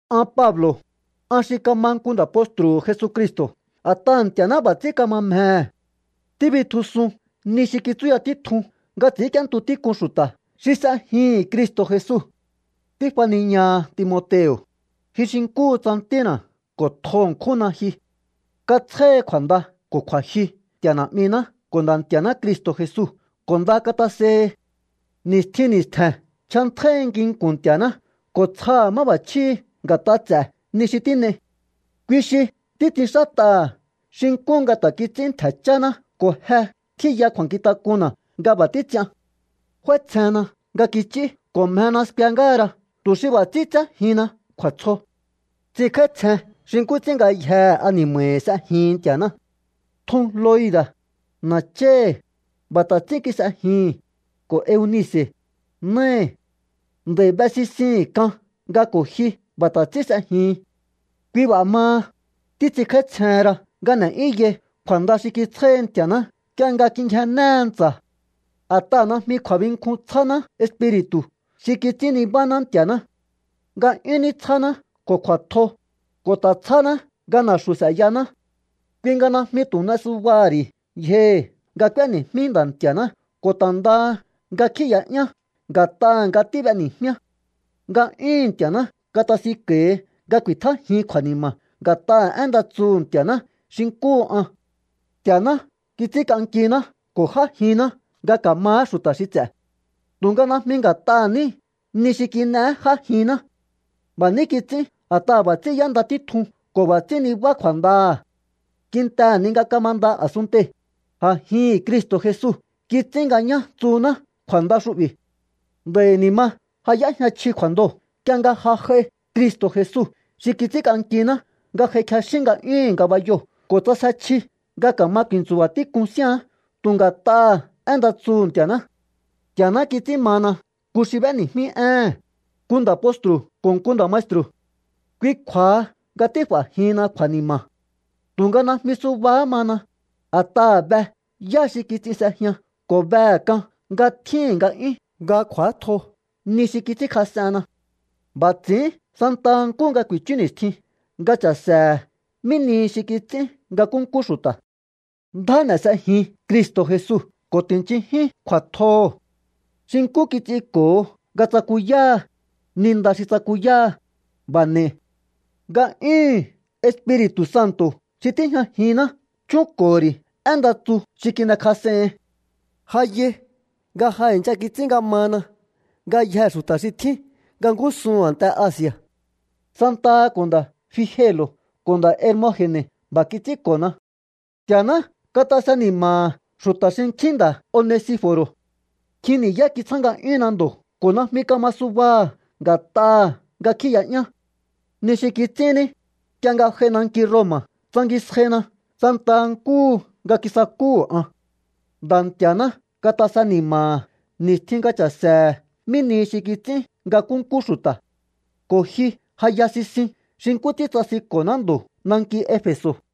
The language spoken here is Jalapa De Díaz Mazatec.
An Pablo̱, an xi kama nku nda̱ postru̱hu̱ Jesucristo̱ a̱t'aha̱ Nti̱a̱ná b'a̱ ts'ín kama mjehe̱. Tíbitjusun ni xi kitsúya títjun nga ts'i̱ínk'íéntu tík'un xu̱ta̱ xi s'ejihi̱n Cristo̱ Jesu. Tífaniñaha Timoteo̱, ji xi nkúhu tsa ntína̱ ko̱ tjo ṉkjúnna ji. Katsjáhi kju̱a̱nda ko̱ kju̱a̱jyu Nti̱a̱ Na̱'miná ko̱ Nda̱ Nti̱a̱ná Cristo̱ Jesu ko̱ nda katasehi. Ni̱stjin ni̱stje̱n nchjantjáíhi nginku̱n Nti̱a̱ná ko̱ tsjaha̱ máb'achjíhi̱ nga̱t'a ts'e̱ ni xi tín'ei. Kui xi títs'inxát'aha̱ xi nkú nga ta̱ kits'ín ntje̱ chána̱ ko̱ je tjíya kju̱a̱nkjintak'unna̱ nga b'a̱ títs'ian. F'áítsjenna nga kich'í ko̱ mjena skue ngáha ra tu̱ xi b'a̱ ts'ín tséjihinna kju̱a̱tsjo. Ts'inkj'áítsjen xi nkú ts'ín ngayjehe ani̱ma̱hi̱ s'ejihin Nti̱aná. Tjun Loi̱da̱, na̱cháhi̱, b'a̱ ta̱ ts'ín kis'ejihi̱n, ko̱ Eunice̱, náhi̱. Nd'a̱i̱ be sisihi̱n k'an nga ko̱ ji b'a̱ ta̱ ts'ín s'ejihin. Kui b'a̱ maha, títs'inkj'áítsjehen ra nga n'e̱'yúnyai kju̱a̱nda xi kitsjáhi Nti̱a̱ná nk'ie nga kingjennéhe ntsa̱. A̱t'aha̱ najmi kju̱a̱binkjun tsjáná Espiri̱tu̱ xi kits'ín nibáná Nti̱a̱ná. Nga'yún ní tsjáná ko̱ kju̱a̱tjo, ko̱ ta̱ tsjáná nga na̱xu̱ s'e̱yaná. Kui nga najmi tu̱ n'e subaha̱ ri̱ yjohi̱ nga k'úéni̱jmí Nda̱ Nti̱a̱ná ko̱ ta̱ ndaha nga kjíi̱ya'yán nga̱t'aha̱ nga tíb'eni̱jmíá. Nga'yúhu̱n Nti̱a̱ná katasinko̱hi nga ku̱i̱tjájin kju̱a̱ni̱ma̱ nga̱t'aha̱ én nda tsuhu̱ Nti̱a̱ná xi nkúhu an. Nti̱a̱ná kits'ínk'ankiná ko̱ j'ájinná nga ka̱maá xu̱ta̱ xi ts'e̱. Tu̱nga najmi nga̱t'aha̱ ní ni xi kin'eé j'ájihinná. B'a̱ ní kits'ín a̱t'aha̱ b'a̱ ts'ín y'énda títjun ko̱ b'a̱ ts'ín nibá kju̱a̱ndaha̱. Kintehe̱ ni nga kamanda a̱sunntei̱, a̱jihi̱n Cristo̱ Jesu kits'ín nga ñá tsuhuná kju̱a̱nda xu'bi̱. Nd'a̱i̱ ni̱ ma ja y'éjña chji kju̱a̱ndoo̱ nk'ie nga ja j'ai Cristo̱ Jesu xi kits'ínk'ankiná nga j'ai kjexín nga'yúhu̱n ngabayoo̱ ko̱ ts'asje chji nga ka̱ma ku̱i̱ntsu̱ba̱ tík'un síán tu̱ ngat'aha̱ én nda tsuhu̱ Nti̱a̱ná. Nti̱a̱ná kits'ín mana nku xi b'éni̱jmí éhe̱n, nku nda̱ postru̱ ko̱ nku nda̱ maestru̱. Kui kju̱a̱ha nga tíf'a̱jihinna kju̱a̱ni̱ma̱. Tu̱nga najmi subahá mana, a̱t'aha̱ be yá xi kits'in s'ejian ko̱ behe̱ k'an nga tjíhi̱n nga'yún nga kj'u̱átjo ni xi kits'ínkjas'enna. B'a̱ ts'i̱ín santaha nkúhu nga ku̱i̱chú ni̱stjin nga cha̱se̱he̱ mí nihi xi kits'ín nga nkúnkú xu̱ta̱. Ndjá n'e̱ s'ejin Cristo̱ Jesu ko̱ ti̱nchinjín kju̱a̱tjoho̱. Xi nkú kits'inko̱ho nga tsakuyáha, ni nda xi tsakuyáha, b'a̱ n'e̱i. Nga'yúhu̱n Espiri̱tu̱ Santo̱ xi tíjñajinná chúnko̱ho̱ ri̱ én nda tsu xi kin'ekjas'ehin. Ja yai nga ja i̱ncha kits'ín nga mana ngayjee̱ xu̱ta̱ xi tjín nga ngúsuhu̱n a̱nte Asi̱a̱. Santaha ko̱ nda̱ Figelo̱ ko̱ nda̱ Hermoge̱ne̱ b'a̱ kits'ínko̱na. Nti̱a̱ná katase ni̱ma̱ha̱ xu̱ta̱ xinkjín nda̱ Onesifo̱ro̱. Nkjin ni̱yá kitsjá nga'yúnna ndo̱ ko̱ najmi kama subaha̱ nga̱t'aha̱ nga kjíi̱ya'yán. Ni xi kits'ín ní, nk'ie nga j'ai nanki Roma̱ tsangisjaina santaha nkúhu nga kisakúhu̱ an. Nda̱ Nti̱a̱ná katase ni̱ma̱ha̱ ni̱stjin nga cha̱se̱he̱ mí nihi xi kits'ín nga nkúnkú xu̱ta̱. Ko̱ ji ja ya sisin xi nkú ts'ín tsasinko̱ná ndo̱ nanki Efe̱so̱.